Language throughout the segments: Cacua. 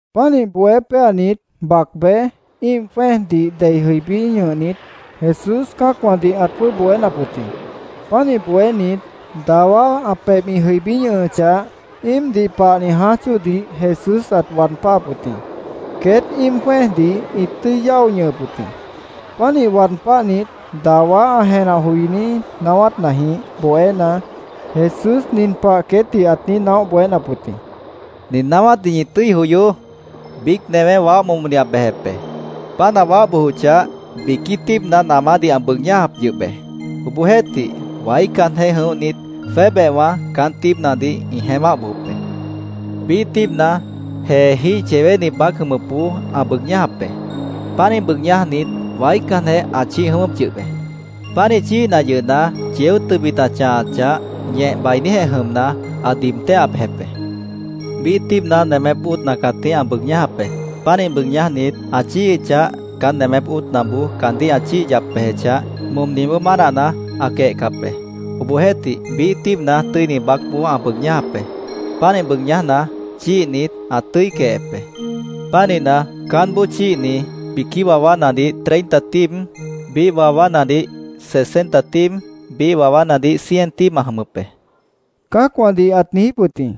Pánih bohé péanit, bac bej, íim jwẽ́ejdih dei jʉibí ñʉhnit, Jesús cã́acwãdih ãt jwʉ́ʉb bohénap wʉt jĩ. Pánih bohénit, dawá ã pebh ĩ jʉibí ñʉhʉchah, íimdih pahni jãáj chóodih Jesús ãt waad páhap wʉt jĩ. Queét íim jwẽ́ejdih ĩt tʉ́i yáo ñʉhʉp wʉt jĩ. Pánih waad páhnit, dawá ã jenah joiní naáwátnajĩh bohéna, Jesús nin pah queétdih ãt niíj naóh bohénap wʉt jĩ: “¡Nin naáwátdih ñi tʉ́i joyoó! Biíc newé waáh momodih ã bejep be. Páant ã waáh bojochah, biquí tíibna namádih ã bʉʉg ñájap yʉh be. Obohjeéhtih, waícanjeh jʉ̃óhnit, jwébehwã caán tíibnadih ĩ jeémáh bojop be. Biíh tíibna jeejíh yewéni baác jʉmʉpboó ã bʉʉg ñájap be. Pánih bʉʉg ñájnit, waícanjeh ã chíih jʉ̃ʉ́wʉ́p yʉh be. Pánih chíihna yʉhna, yeó tʉbit ã chãhachah, ñeh bainíjeh jʉmna, ã diib téhah bejep be. Biíh tíibna nemép óotna cãtíh ã bʉʉg ñájap be. Pánih bʉʉg ñájnit, ã chíihichah, caán nemép óotnaboó caandíh ã chíih yap bejechah, momniboó mánahna, ã quehcap be. Obohjeéhtih, biíh tíibna tʉ́ini baácboó ã bʉʉg ñájap be. Pánih bʉʉg ñájna, chíihnit, ã tʉ́i quehep be. Pánihna, caánboó chíihni biquí wawánadih treinta tíib, biíh wawánadih sesenta tíib, biíh wawánadih cien tíib ã jʉmʉp be”, cã́acwãdih ãt niijíp wʉt jĩ.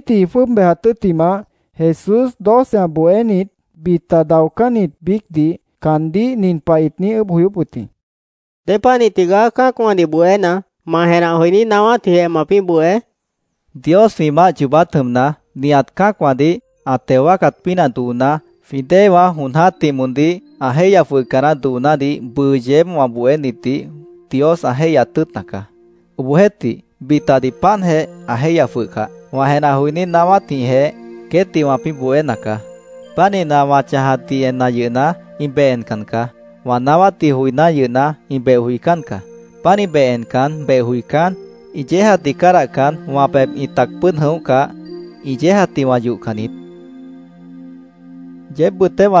Queét joinítji ĩ jwʉ́ʉb bejat tʉ́ttimah, Jesús doce ã bohénit, bita daocánnit biícdih caandíh nin pah ĩt niíj ʉʉ́bh joyóp wʉt jĩ: —¿Dépanih tigaá cã́acwãdih bohéna, ma jenah joiní naáwátjĩhjeh mapĩ́ bohé? caandíh ĩt niijíp wʉt jĩ. —Dios jwĩ Maáh yoobát jʉmna, nihat cã́acwãdih ã teo wáacat pínah dooná, jwĩ déewã jon jã́tih moondíh ã jéihya jwʉhca naáh doonádih bʉʉ yeéb wã bohénitdih Dios ã jéihyat tʉ́ʉtna caá. Obohjeéhtih, bitadih páantjeh ã jéihya jwʉhcah, wã jenah joiní naáwátjĩhjeh queétdih wãpĩ́ bohéna caá. Pánihna, wã chãjatdih enna yʉhna, ĩ beh encan caá. Wã naáwátdih joiná yʉhna, ĩ beh joicán caá. Pánih beh encan, beh joicán, ĩ yéejatdih cádahcan, wã pebh ĩ tac pʉ́ʉd jʉ̃óhcah, ĩ yéejatdih wã yohcan niít, Jesús queétdih ãt niijíp wʉt jĩ.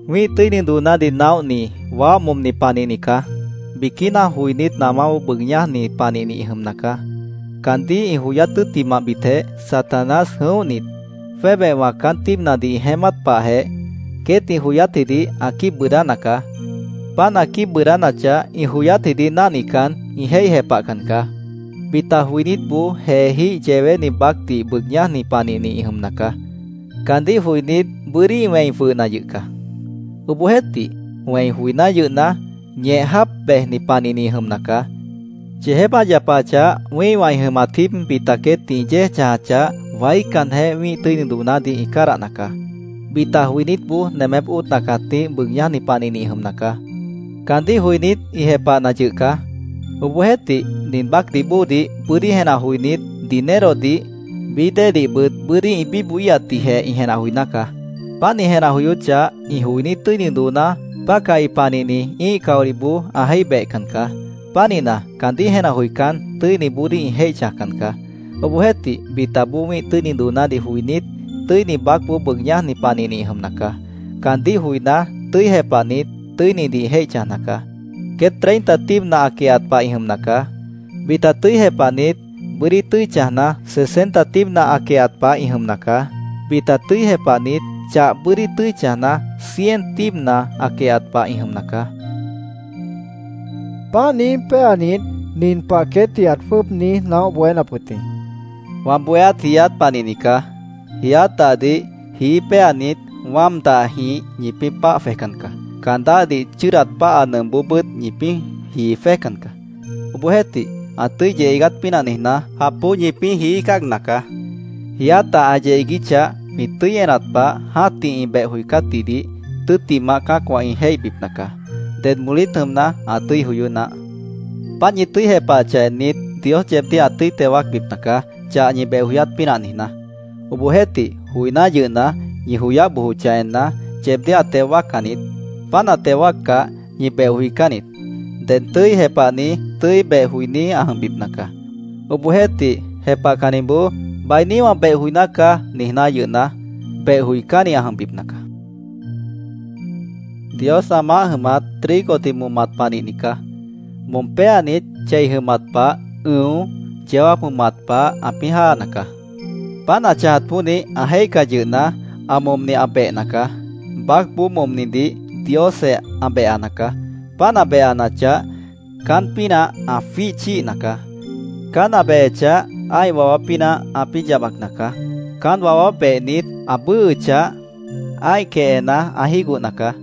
“Wĩ́ih tʉ́ini doonádih naóhni, waáh momni panihni caá. Biquína joinít namáboó bʉʉg ñájni panihni ĩ jʉmna caá. Caandíh ĩ joyát tʉ́ttimahbitjeh, Satanás jʉ̃óhnit, jwébehwã caán tíibnadih ĩ jeémát pahjeh, queét ĩ joyátjidih ã quíib bʉʉdána caá. Páant ã quíib bʉʉdánachah, ĩ joyátjidih náhnican, ĩ jéih jepahcan caá. Bita joinítboó jeejíh yewéni baácdih bʉʉg ñájni panihni ĩ jʉmna caá. Caandíh joinít, bʉ́dí ĩ wẽi jwʉhna yʉh caá. Obohjeéhtih, wẽi joiná yʉhna, ñeh jáap bejni panihni ĩ jʉmna caá. Yeejép ã yapachah, wĩ́ihwã ĩ jʉmat jíib bita queétdih ĩ yéej chãjachah, waícanjeh wĩ́ih tʉ́ini doonádih ĩ cádahna caá. Bita joinítboó nemép óotna cãtíh bʉʉg ñájni panihni ĩ jʉmna caá. Caandíh joinít, ĩ jepahna yʉh caá. Obohjeéhtih, nin baácdih bóodih bʉ́dí jenah joinít, dinerodih, bií déedihbʉt bʉ́dí ĩ bíbohíhatdihjeh ĩ jenah joiná caá. Páant ĩ jenah joyóchah, ĩ joiní tʉ́ini dooná pácahi panihni ĩ́ih caolihboó ã jéih behcan caá. Pánihna, caandíh jenah joicán, tʉ́iniboodíh ĩ jéih chãjcan caá. Obohjeéhtih, bitaboó wĩ́ih tʉ́ini doonádih joinít, tʉ́ini baácboó bʉʉg ñájni panihni ĩ jʉmna caá. Caandíh joiná, tʉ́i jepahnit, tʉ́inidih ĩ jéih chãjna caá. Queét treinta tíibna ã quehat pah ĩ jʉmna caá. Bita tʉ́i jepahnit, bʉ́dí tʉ́i chãjna, sesenta tíibna ã quehat pah ĩ jʉmna caá. Bita tʉ́i jepahnit, chah bʉ́dí tʉ́i chãjna, cien tíibna ã quehat pah ĩ jʉmna caá”, Jesús ãt niijíp wʉt jĩ. Páant niíj péanit, nin pah queétdih ãt jwʉ́ʉb niíj naóh bohénap wʉt jĩ: “Wã bohéát jiiát panihni caá. Jiiát dahdih jií péanit, wáam dahjĩh ñipĩ́ páah jwejcan caá. Caan dáhdih chʉ́ʉdat páha nʉmpboobʉ́t ñipĩ́ jii jwéjcan caá. Obohjeéhtih, ã tʉ́i yeh iigát pínah niijná, japboó ñipĩ́ jií cáagna caá. Jiiát dah ã yeh iiguíchah jwĩ tʉ́i enat pah, jã́tih ĩ beh joicátjidih tʉ́ttimah cã́acwã ĩ jéihbipna caá. ¡Ded molít jʉmna, ã tʉ́i joyó naáh! Páant ñi tʉ́i jepahachah ennit, Dios yeebdíh ã tʉ́i teo wáacbipna caá, chah ñi beh joyát pínah niijná. Obohjeéhtih, joiná yʉhna, ñi joyáh bojochah enna, yeebdíh ã teo wáaccan niít. Páant ã teo wáaccah, ñi beh joicán niít. Ded tʉ́i jepahni tʉ́i beh joiní ã jʉmbipna caá. Obohjeéhtih, jepahcanniboó ‘Bainí wã beh joiná caá’, niijná yʉhna, beh joicánni ã jʉmbipna caá”, ãt niijíp wʉt jĩ. “Dios ã maáh jʉmat, trigodih momat panihni caá. Mom péanit, chei jʉmat pah ʉ̃o, yeó jáap jʉmat pah ãpĩ́ jáana caá. Páant ã chãjat pónih, ã jéihcah yʉhna, ã momni ã behna caá. Baácboó momnidih Diosjeh ã behana caá. Páant ã behanachah, caán pínah ã jwíih chíihna caá. Caán ã behechah, ã́ih wawá pínah ãpĩ́ yabacna caá. Caán wawá behnit, ã bʉ́ʉhʉchah, ã́ih quehena ã jígohna caá.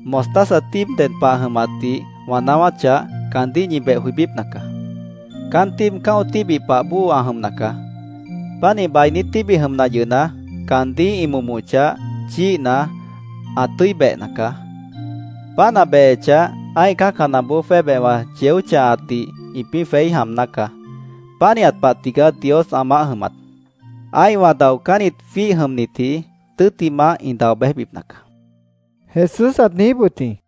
Mostaza tíib ded pah ã jʉmatdih wã naáwáchah, caandíh ñi beh joibípna caá. Caán tíib cã́o tíbih pah bóo ã jʉmna caá. Pánih bainí tíbih jʉmna yʉhna, caandíh ĩ momochah, chíihna, ã tʉ́i behna caá. Páant ã behechah, ã́ih cã́canaboó jwébehwã yeó chãhatdih ĩpĩ́ jweí jaamná caá. Pánihat pah tigaá Dios ã maáh jʉmat. Ã́ihwã daocánnit jwíih jʉmnitji, tʉ́ttimah ĩ dao béjbipna caá”, Jesús ãt niijíp wʉt jĩ.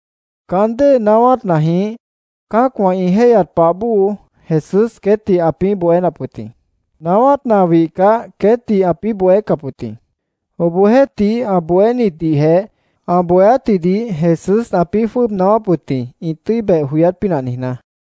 Caán dée naáwátnajĩh cã́acwã ĩ jéihyat pah bóo Jesús queétdih ãpĩ́ bohénap wʉt jĩ. Naáwátna ã wihcah, queétdih ãpĩ́ bohécap wʉt jĩ. Obohjeéhtih, ã bohénitdihjeh ã bohéátjidih Jesús ãpĩ́ jwʉ́ʉb naáwáp wʉt jĩ, ĩ tʉ́i beh joyát pínah niijná.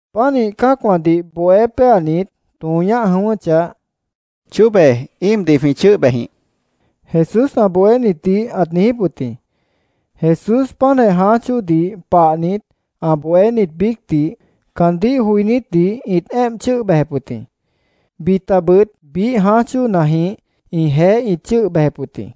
Pánih cã́acwãdih bohé péanit, tõo ñáh jʉ̃ʉ́wʉ́chah, —Chóbe íimdih jwĩ chʉ́ʉh bejjĩh, Jesús ã bohénitdih ãt niijíp wʉt jĩ. Jesús páantjeh jãáj chóodih pahnit, ã bohénit biícdih, caandíh joinítdih ĩt éemp chʉ́ʉh bejep wʉt jĩ. Bitabʉt biíh jãáj chóonajĩh ĩjeéh ĩt chʉ́ʉh bejep wʉt jĩ.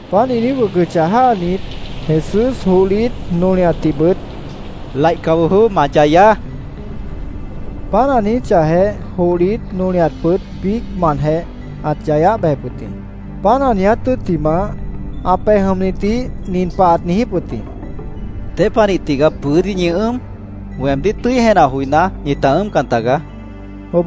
Páant ĩ niíj wʉcʉchah jáanit, Jesús johlit, nolihatdihbʉt —¡Laihca bojoó! ¡Ma yayaá! ãt niíj jʉ̃ihñʉp wʉt jĩ. Páant ã niijíchahjeh, johlit, nolihatbʉt biícmantjeh ãt yayáh bejep wʉt jĩ. Páant ã niiját tʉ́ttimah, ã pej jʉmnitdih nin pah ãt niijíp wʉt jĩ: —¿Dépanih tigaá bʉ́dí ñi ʉ́ʉm? Weemdíh tʉ́i jenah joiná, ñita ʉ́ʉmcan tagaá, ãt niijíp wʉt jĩ.